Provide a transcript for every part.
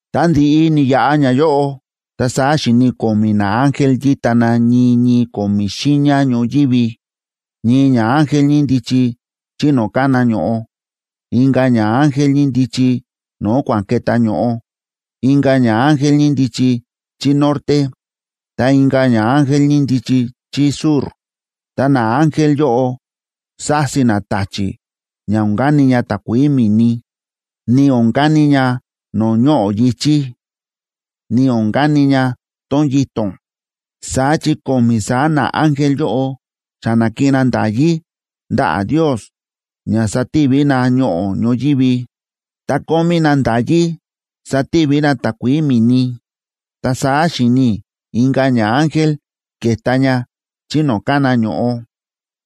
Tá ndi̱ꞌi ni̱yaꞌa ñayóꞌo, ta saá xi̱ni i̱ ko̱mi̱ naángel yíta na ñii ñii ko̱mi̱ xiiña ñoyívi: ñii ñaángel ñíndichi chí no̱o̱ kána ño̱ꞌo, inka̱ ñaángel ñíndichi no̱o̱ kua̱ꞌa̱n ke̱tá ño̱ꞌo, inka̱ ñaángel ñíndichi chí norte, ta inka̱ ñaángel ñíndichi chí sur. Ta naángel yóꞌo sási na ta̱chi̱ ña o̱n kani ña takuií mi̱ni, ni o̱n kani ña no̱o̱ ñoꞌo̱ yi̱chí, ni o̱n kani ña tón yito̱n. Saá chi ko̱mi̱ saá naángel yóꞌo xa na̱kiꞌin na nda̱yí ndaꞌa̱ Ndios ña sativi na ñoꞌo̱ ñoyívi, ta kómí na nda̱yí sativi na takuií mi̱ni. Ta saá xi̱ni i̱ inka̱ ñaángel ke̱ta ña chí no̱o̱ kána ño̱ꞌo,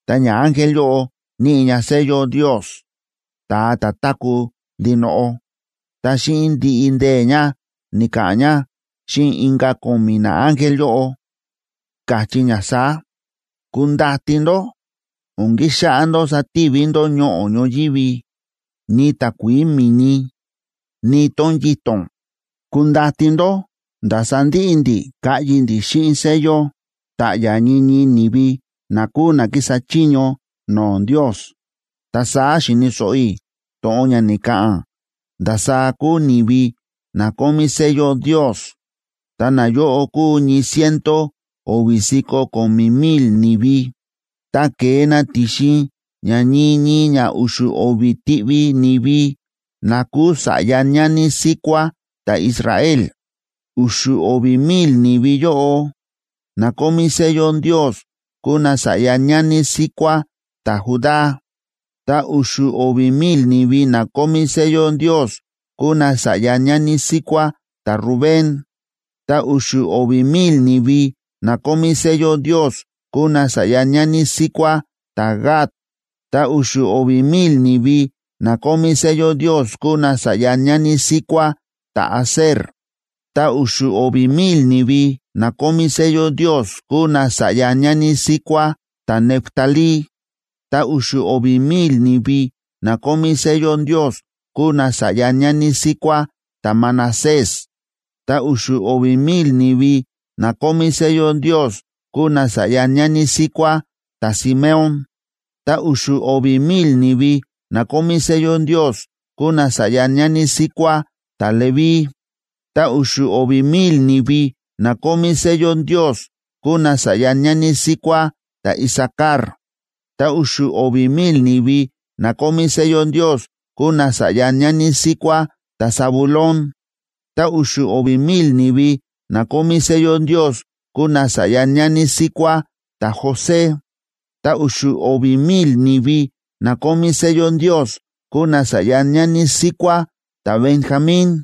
ta ñaángel yóꞌo níꞌi ña sello Ndios, ta̱a ta̱ táku̱ ndinoꞌo. Ta xíꞌin ndiꞌi ndee̱ ña, ni̱ka̱ꞌa̱n ña xíꞌin inka̱ ko̱mi̱ naángel yóꞌo, káchí ña saá: ―¡Kundati ndó! O̱n kixáꞌá ndó sativi ndó ñoꞌo̱ ñoyívi, ni takuií mi̱ni, ni tón yito̱n. Kundati ndó nda̱ sandiꞌi ndi̱ kaꞌyi ndi̱ xíꞌin sello ta̱ꞌya̱ ñii ñii ni̱vi na kúu na kísa chiño no̱o̱ Ndios. Ta saá xi̱ni̱ so̱ꞌo i̱ to̱ꞌon ña ni̱ka̱ꞌa̱n ndasaá kúu ni̱vi na kómí sello Ndios, ta nayóꞌo kúu ñii ciento o̱vi̱ si̱ko̱ ko̱mi̱ mil ni̱vi, ta ke̱e na ti̱xin ña ñii ñii ña u̱xu̱ o̱vi̱ tiꞌvi ni̱vi na kúu sa̱ꞌya ñani síkuá ta̱Israel. U̱xu̱ o̱vi̱ mil ni̱vi yóꞌo, na kómí sello Ndios kúu nasa̱ꞌya ñani síkuá ta̱Judá. Ta u̱xu̱ o̱vi̱ mil ni̱vi na kómí sello Ndios kúu nasa̱ꞌya ñani síkuá ta̱Rubén. Ta u̱xu̱ o̱vi̱ mil ni̱vi na kómí sello Ndios kúu nasa̱ꞌya ñani síkuá ta̱Gad. Ta u̱xu̱ o̱vi̱ mil ni̱vi na kómí sello Ndios kúu nasa̱ꞌya ñani síkuá ta̱Aser. Ta u̱xu̱ o̱vi̱ mil ni̱vi na kómí sello Ndios kúu nasa̱ꞌya ñani síkuá ta̱Neftalí, ta u̱xu̱ o̱vi̱ mil ni̱vi na kómí sello Ndios kúu nasa̱ꞌya ñani síkuá ta̱Manasés. Ta u̱xu̱ o̱vi̱ mil ni̱vi na kómí sello Ndios kúu nasa̱ꞌya ñani síkuá ta̱Simeón. Ta u̱xu̱ o̱vi̱ mil ni̱vi na kómí sello Ndios kúu nasa̱ꞌya ñani síkuá ta̱Leví. Ta u̱xu̱ o̱vi̱ mil ni̱vi na kómí sello Ndios kúu nasa̱ꞌya ñani síkuá ta̱Isacar. Ta u̱xu̱ o̱vi̱ mil ni̱vi na kómí sello Ndios kúu nasa̱ꞌya ñani síkuá ta̱Zabulón. Ta u̱xu̱ o̱vi̱ mil ni̱vi na kómí sello Ndios kúu nasa̱ꞌya ñani síkuá ta̱José, ta u̱xu̱ o̱vi̱ mil ni̱vi na kómí sello Ndios kúu nasa̱ꞌya ñani síkuá ta̱Benjamín.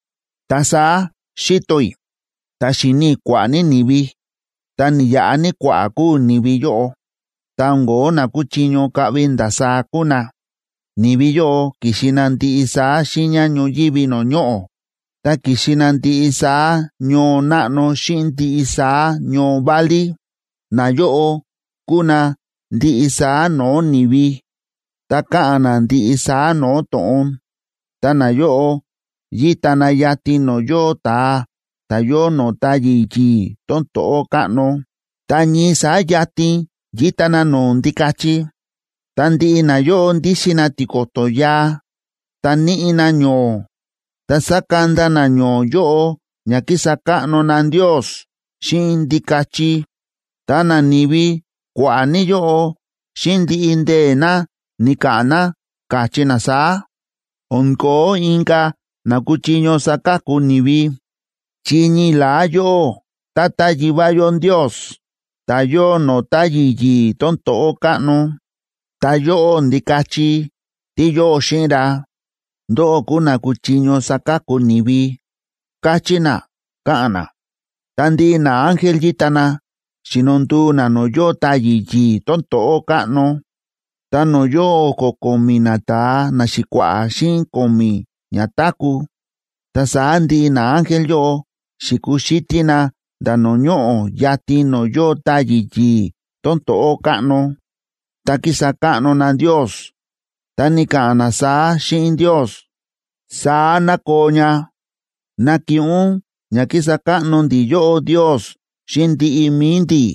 Ta saá xi̱to i̱, ta xi̱ni i̱ kua̱ꞌa̱ ní ni̱vi, ta ni̱yaꞌa ní kua̱ꞌa̱ kúu ni̱vi yóꞌo. Ta o̱n ko̱ó na kuchiño kaꞌvi ndasaá kúu na. Ni̱vi yóꞌo ki̱xi na ndiꞌi saá xiiña ñoyívi no̱o̱ ñoꞌo̱, ta ki̱xi na ndiꞌi saá ñoo náꞌno xíꞌin ndiꞌi saá ñoo válí. Nayóꞌo kúu na ndiꞌi saá no̱o̱ ni̱vi, ta káꞌa̱n na ndiꞌi saá no̱o̱ to̱ꞌon. Ta nayóꞌo yíta na yatin no̱o̱ yóo ta̱a ta̱ yóo no̱o̱ táyi̱ yi̱i̱ tón to̱ꞌó káꞌno, ta ñii saá yatin yíta na no̱o̱ Ndikachi. Ta ndiꞌi nayóꞌo ndíxin na tiko̱to̱ yaa, ta níꞌi na ño̱o̱, ta sa̱kanda na ño̱o̱ yóꞌo ña kísa káꞌno na Ndios xíꞌin Ndikachi. Ta nani̱vi kua̱ꞌa̱ ní yóꞌo, xíꞌin ndiꞌi ndee̱ na, ni̱ka̱ꞌa̱n na, káchí na saá: O̱n ko̱ó inka̱ na kúchiño saka̱ku ni̱vi, chi ñii la̱á yóꞌó, Tata Yivá yó Ndios, ta̱ yóo no̱o̱ táyi̱ yi̱i̱ tón to̱ꞌó káꞌno, ta yóꞌó, Ndikachi, tí yóo xíꞌin ra, ndóꞌó kúu na kúchiño saka̱ku ni̱vi, káchí na, káꞌa̱n na. Ta ndiꞌi naángel yíta na, xíno nduu na no̱o̱ yóo táyi̱ yi̱i̱ tón to̱ꞌó káꞌno, ta no̱o̱ yóo o̱ko̱ ko̱mi̱ nata̱a naxi̱kua̱ꞌa̱ xíꞌin ko̱mi̱ ñatáku̱. Ta saá ndiꞌi naángel yóꞌo xi̱kuxítí na nda̱ no̱o̱ ñoꞌo̱ yatin no̱o̱ yóo táyi̱ yi̱i̱ tón to̱ꞌó káꞌno, ta ki̱sa káꞌno na Ndios. Ta ni̱ka̱ꞌa̱n na saá xíꞌin Ndios: ¡Saá ná koo ña! ¡Nakiꞌin ún ña kísa káꞌno ndi̱ yóꞌó Ndios xíꞌin ndiꞌi mi̱i ndi̱!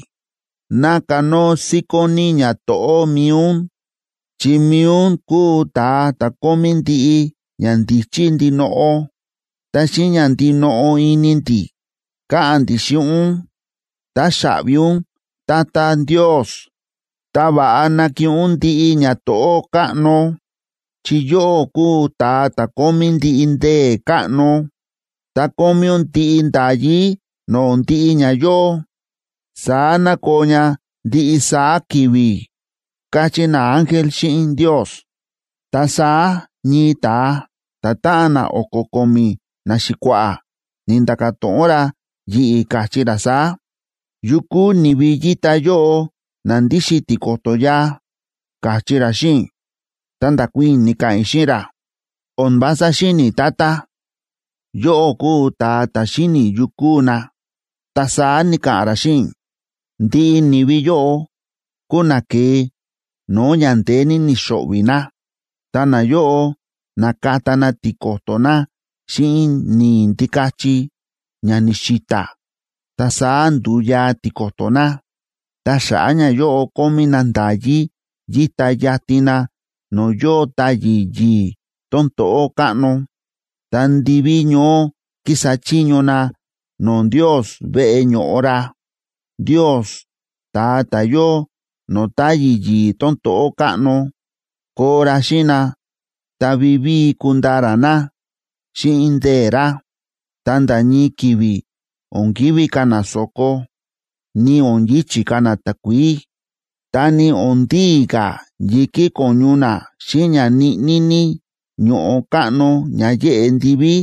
¡Ná kanóo síkón ní ñato̱ꞌó mi̱i ún! ¡Chi mi̱i ún kúu ta̱a ta̱ kómí ndiꞌi ñandíchí ndinoꞌo! Ta xíꞌin ña ndinoꞌo ini ndi̱, káꞌa̱n ndi̱ xíꞌin ún: “¡Táxaꞌvi ún, Tata Ndios!” ¡Ta va̱ꞌa nakiꞌin ún ndiꞌi ñato̱ꞌó káꞌno! Chi yóꞌó kúu ta̱a ta̱ kómí ndiꞌi ndee̱ káꞌno, ta kómí ún ndiꞌi nda̱yí no̱o̱ ndiꞌi ña yóo. ¡Saá ná koo ña ndiꞌi saá ki̱vi̱! káchí naángel xíꞌin Ndios. Ta saá ñii ta̱a ta̱táꞌan na o̱ko̱ ko̱mi̱ naxi̱kua̱ꞌa̱, ni̱nda̱ka̱ to̱ꞌon ra yi̱ꞌi̱, káchí ra saá: ―¿Yu kúu ni̱vi yíta yóꞌo, na ndíxin tiko̱to̱ yaa? ―káchí ra xíꞌin i̱. Ta nda̱kuii̱n i̱, ni̱ka̱ꞌa̱n i̱ xíꞌin ra: ―O̱n vása xíni̱ i̱, Tata. Yóꞌó kúu ta̱a ta̱ xíni̱ yu kúu na. Ta saá ni̱ka̱ꞌa̱n ra xíꞌin i̱: ―Ndiꞌi ni̱vi yóꞌo kúu na ke̱e no̱o̱ ña ndeé ní ni̱xo̱ꞌvi̱ na. Ta nayóꞌo na̱kata na tiko̱to̱ na xíꞌin ni̱i̱ Ndikachi ña ni̱xi̱ta̱, ta saá ndu̱yaa tiko̱to̱ na. Ta xa̱ꞌa̱ ñayóꞌo kómí na nda̱yí yíta yatin na no̱o̱ yóo táyi̱ yi̱i̱ tón to̱ꞌó káꞌno. Ta ndiví ñoó kísa chiño na no̱o̱ Ndios veꞌe ño̱ꞌo ra. Ndios, ta̱a ta̱ yóo no̱o̱ táyi̱ yi̱i̱ tón to̱ꞌó káꞌno, koo ra xíꞌin na ta vivíi kundaa ra na xíꞌin ndee̱ ra. Ta nda̱ ñii ki̱vi̱ o̱n kivi̱ ka̱ na so̱ko, ni o̱n yi̱chi̱ ka̱ na takuií. Ta ni o̱n ndii ka̱ yi̱kí ko̱ñu na xíꞌin ña ñiꞌní ní ño̱ꞌo káꞌno ña yéꞌe ndiví,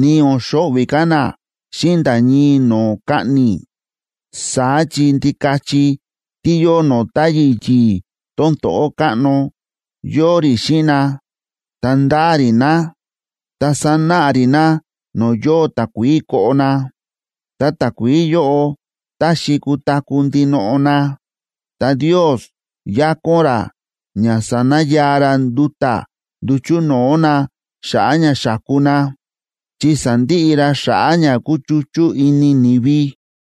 ni o̱n xo̱ꞌvi̱ ka̱ na xíꞌin nda̱ ñii no̱o̱ kaꞌni̱. Saá chi Ndikachi tí yóo no̱o̱ táyi̱ yi̱i̱ tón to̱ꞌó káꞌno, yóo rí xíꞌin na ta ndáa rí na. Ta sánáꞌa rí na no̱o̱ yóo takuií koꞌo na, ta takuií yóꞌo taxi kutaku̱ ndinoꞌo na. Ta Ndios yakón ra ña sanayaa ra nduta̱ nduchu̱ no̱o̱ na xa̱ꞌa̱ ña xa̱ku na, chi sandiꞌi ra xa̱ꞌa̱ ña kúchuchú ini ni̱vi.